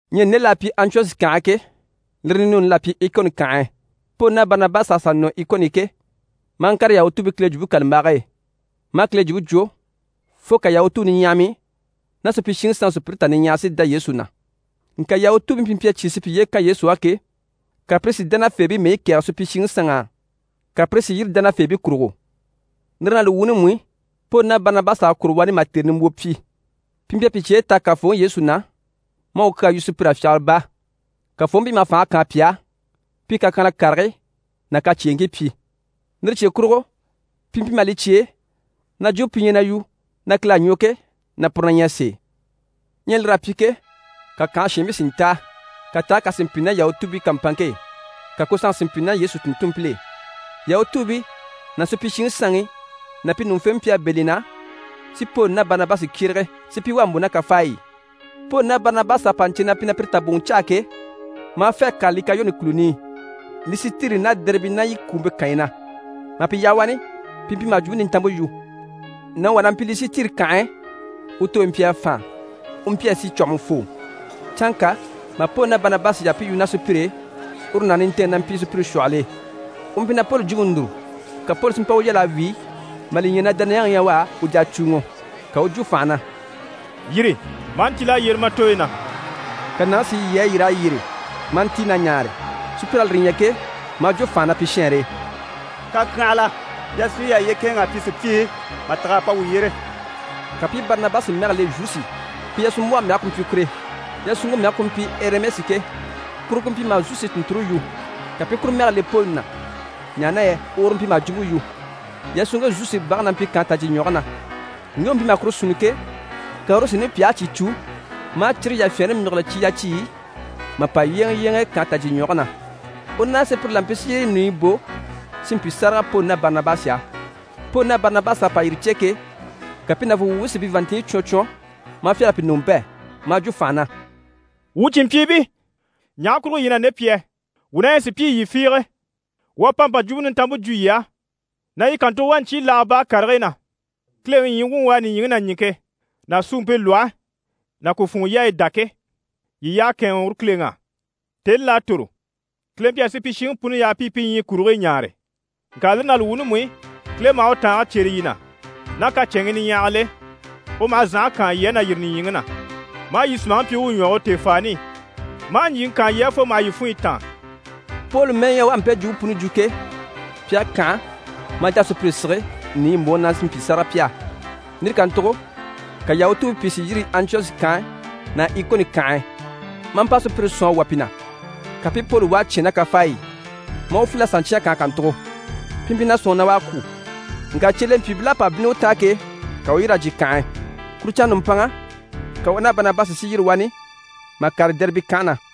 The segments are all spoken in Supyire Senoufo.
Ɲyɛ nde l'à pyi Antiyɔshi kànhe e ke, lire ninuuni l'à pyi Ikoni kànhe e. Poli ná Barinabasi à sà nɔ Ikoni i ke, maa ŋkàre YahutuubiiKile Jwumpe kàlambage e, maa Kile Jwumpe jwo fo ka Yahutuu niɲyahamii ná supyishiŋi sanŋi sùpyire tà niɲyahara si dá Yesu na. Ŋka Yahutuubii pi mpyi a cyé si piye kan Yesu á ke, ka pire si dánafeebii mɛyi kɛ̀ɛgɛ supyishiŋi sanŋ'á, ka pire si yîri dánafeebii kurugo. Lire ná li wuuni mú i, Poli ná Barinabasi à kwôro wani mà tère nimbwoo pyi. Pi mpyi a pi cyɛge taha Kafooŋi Yesu na maa u kyaa yu sùpyir'á fyagara baa. Kafooŋi mpyi maha fànhe kaan pi á, pi i kakyanhala karigii ná kacyeeŋkii pyi. Lire cye kurugo pi mpyi maha li cyêe na jwumpe pi ɲyɛ na yu na Kile à ɲwɔ ke, na puru na ɲyɛ sèe. Ɲyɛ lir'à pyi ke, ka kànhe shiinbii si ntáa, ka taage kà si mpyi ná Yahutuubii kàmpanŋke e, ka ku sanŋke si mpyi ná Yesu tùnntunmpil'e. Yahutuubii ná supyishiŋi sanŋi ná pi ɲùŋufeebii mpyi a bɛ̂ li na, si Poli ná Barinabasi kyérege, si pi wà mbò ná kafaayi i. Poli ná Barinabasi à pa ɲcè na pi na pire taboŋɔ caa ke, maa fê a kàre Likayoni kùluni i, Lisitiri ná Dɛribe ná yi kwùumpe kànyi na. Mà pi yaha wani, pi mpyi maha Jwumpe Nintanmpe yu. Nàŋi wà na mpyi Lisitiri kànhe e, u tooyi mpyi a fàan. U mpyi a si cwɔ̀hɔmɔfoo. Canŋka mà Poli ná Barinabasi yaha pi i yu ná sùpyire e, uru nàŋi nintɛɛnŋi na mpyi sùpyire shwɔhɔl'e. U mpyi na Poli jwumpe núru. Ka Poli si mpa u yal'a wíi mà li ɲya na dániyaŋi ɲyɛ u á, u jà a cùuŋɔ. Ka u u jwo fànha na: «Yîri, ma a ntíl'a yyére ma tooyi na!» Ka nàŋi si yi a yîr'a yyére, maa ntíi na ɲaare. Sùpyir'à lire ɲya ke, maa jwo fànha na pi shɛɛnre e: «Kakyanhala! Yasunɲyi yà à yiye kɛ̂ɛnŋ'a pyi sùpyii, mà tîg'a pa wuu yyére!» Ka pi i Barinabasi mɛgɛ le Zusi, pi yasunmbwɔhe mɛge ku mpyi kure. Yasunŋke mɛge ku mpyi Ɛrimɛsi ke, kuru ku mpyi maha Zusi tùnnture yu, ka pi i kuru mɛge le Poli na, ɲaha na yɛ uru mpyi maha jwumpe yu. Yasunŋke Zusi bage na mpyi kànhe tajyiɲwɔge na. Ŋge u mpyi maha kuru sunni ke, ka uru si nupyahigii cyìi cû, maa cire yafyɛɛnre myígile cyi yaciyi i, mà pa yyéeŋɛ yyéeŋɛ kànhe tajyiɲwɔge na. U ná sùpyire la mpyi si yire nìiyi bò si mpyi sáraga Poli ná Barinabasi á. Poli ná Barinabasi à pa yire cè ke, ka pi nàvunŋɔ wuubii si pi vàanntinɲyi cwɔn cwɔn, maa fyâl'a pi ɲùŋɔ bɛ̂, maa jwo fànha na: «Wuu cìnmpyiibii, ɲaha kurugo yii ɲyɛ na nde pyi yɛ? Wuu na ɲyɛ sùpyii, yii fiige. Wuu à pa mpa Jwumpe Nintanmpe jwo yii á, na yii kàntugo wà ɲcyii laaga baa karigii na, Kileŋi ɲyii wuŋi u à nìɲyiŋi ná ɲìŋke ná suumpe lwɔhe ná ku funŋɔ yaayi dá ke, yii i yyaha kɛ̂ɛnŋɛ uru Kileŋi á. Tèni là à tòro, Kile mpyi a supyishiŋi puni yaha pi i pi ɲyii kurigii ɲaare. Ŋka lire ná li wuuni mú i, Kile maha u tàange cyêre yii na ná kacɛnŋii niɲyahagil'e: u maha zànhe kaan yii á na yîri nìɲyiŋi na, maa yii sùmaŋi pyi u u ɲwɔge u tèefaani i, maa ɲjyìŋi kaan yii á fo maha yii funɲyi táan.» Poli mɛ́ɛ ɲyɛ u à mpe jwumpe puni jwo ke, pi à kànha maa jà a sùpyire sige nìiyi mbòŋi na, si mpyi sáraga pi á. Lire kàntugo ka Yahutuubii pìi si yîri Antiyɔshi kànhe ná Ikoni kànhe e, maa mpa sùpyire sɔ̀n a wà pi na, ka pi i Poli wà a cyán ná kafaayi i, maa u filil'a sà ɲcyán kànhe kàntugo. Pi mpyi na sɔ̂nŋi na u à kwû. Ŋka cyelempyiibil'à pa bínni u taan ke, ka u u yîri mà jyè kànhe e. Kuru canŋa nùmpanŋa, ka u ná Barinabasi si yîri wani mà kàre Dɛribe kànhe na.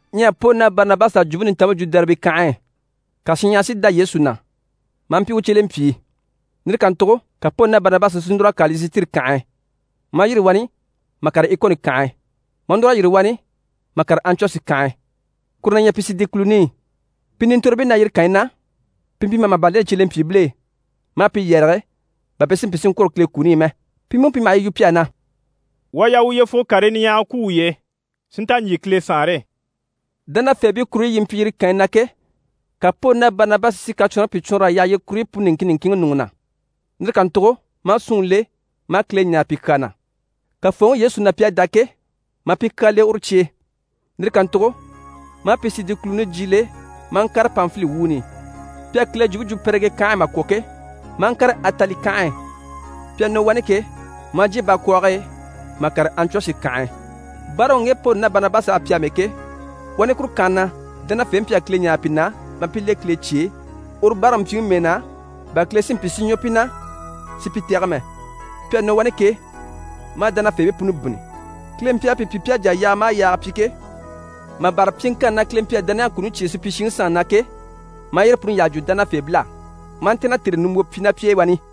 Ɲyɛ Poli ná Barinabasi à Jwumpe Nintanmpe jwo Dɛribe kànhe e, ka shinɲyahara si dá Yesu na, maa mpyi u cyelempyii. Lire kàntugo ka Poli ná Barinabasi si núr'a kàre Lisitiri kànhe e, maa yîri wani mà kàre Ikoni kànhe e, maa núr'a yîri wani mà kàre Antiyɔshi kànhe e, kuru na ɲyɛ Pisidi kùluni i. Pi nintorobii na yire kànyi na, pi mpyi maha màban leni cyelempyiibil'e, maa pi yɛrɛge bà pi si mpyi si ŋkwôro Kile kuni i mɛ. Pi mú mpyi maha yi yu pi á na: «Wuu à yaa wuu yyefugo karii niɲyahagii kwú wuye e si nta ɲjyè Kile Saanre e.» Dánafeebii kuruɲyi yi mpyi yire kànyi na ke, ka Poli ná Barinabasi si kacwɔnribii pìi cwɔɔnr'a yaha yire kuruɲyi puni niŋkin niŋkinŋi ɲùŋɔ na. Lire kàntugo maa súnŋi le, maa Kile ɲáare pi kyaa na. Kafooŋi Yesu na pi à dá ke, maa pi kyaa le uru cye e. Lire kàntugo maa Pisidi kùluni jyiile maa ŋkàre Panfili wuuni i. Pi à Kile jwumpe jwo Pɛrigɛ kànhe e mà kwɔ̀ ke, maa ŋkàre Atali kànhe e. Pi à nɔ wani ke, maa jyè bakwɔɔge e mà kàre Antiyɔshi kànhe e. Báaraŋi u ŋge Poli ná Barinabasi à pyi amɛ ke, wani kuru kànhe na dánafeebii mpyi a Kile ɲáare pi na maa pi le Kile cye e uru báaraŋi mpyiŋi mɛɛ na, bà Kile si mpyi si ɲwɔ pi na si pi tɛ̀gɛ mɛ. Pi à nɔ wani ke, maa dánafeebii puni bínni. Kile mpyi a pi pyi pi à jà a yaaga maha yaaga pyi ke, mà bâra pyiŋkanni na Kile mpyi a dániyaŋi kuni cyêe supyishiŋi sanŋi na ke, maa yire puni yyaha jwo dánafeebil'á. Maa ntɛ̀nn'a tère nimbwoo pyi ná pi e wani.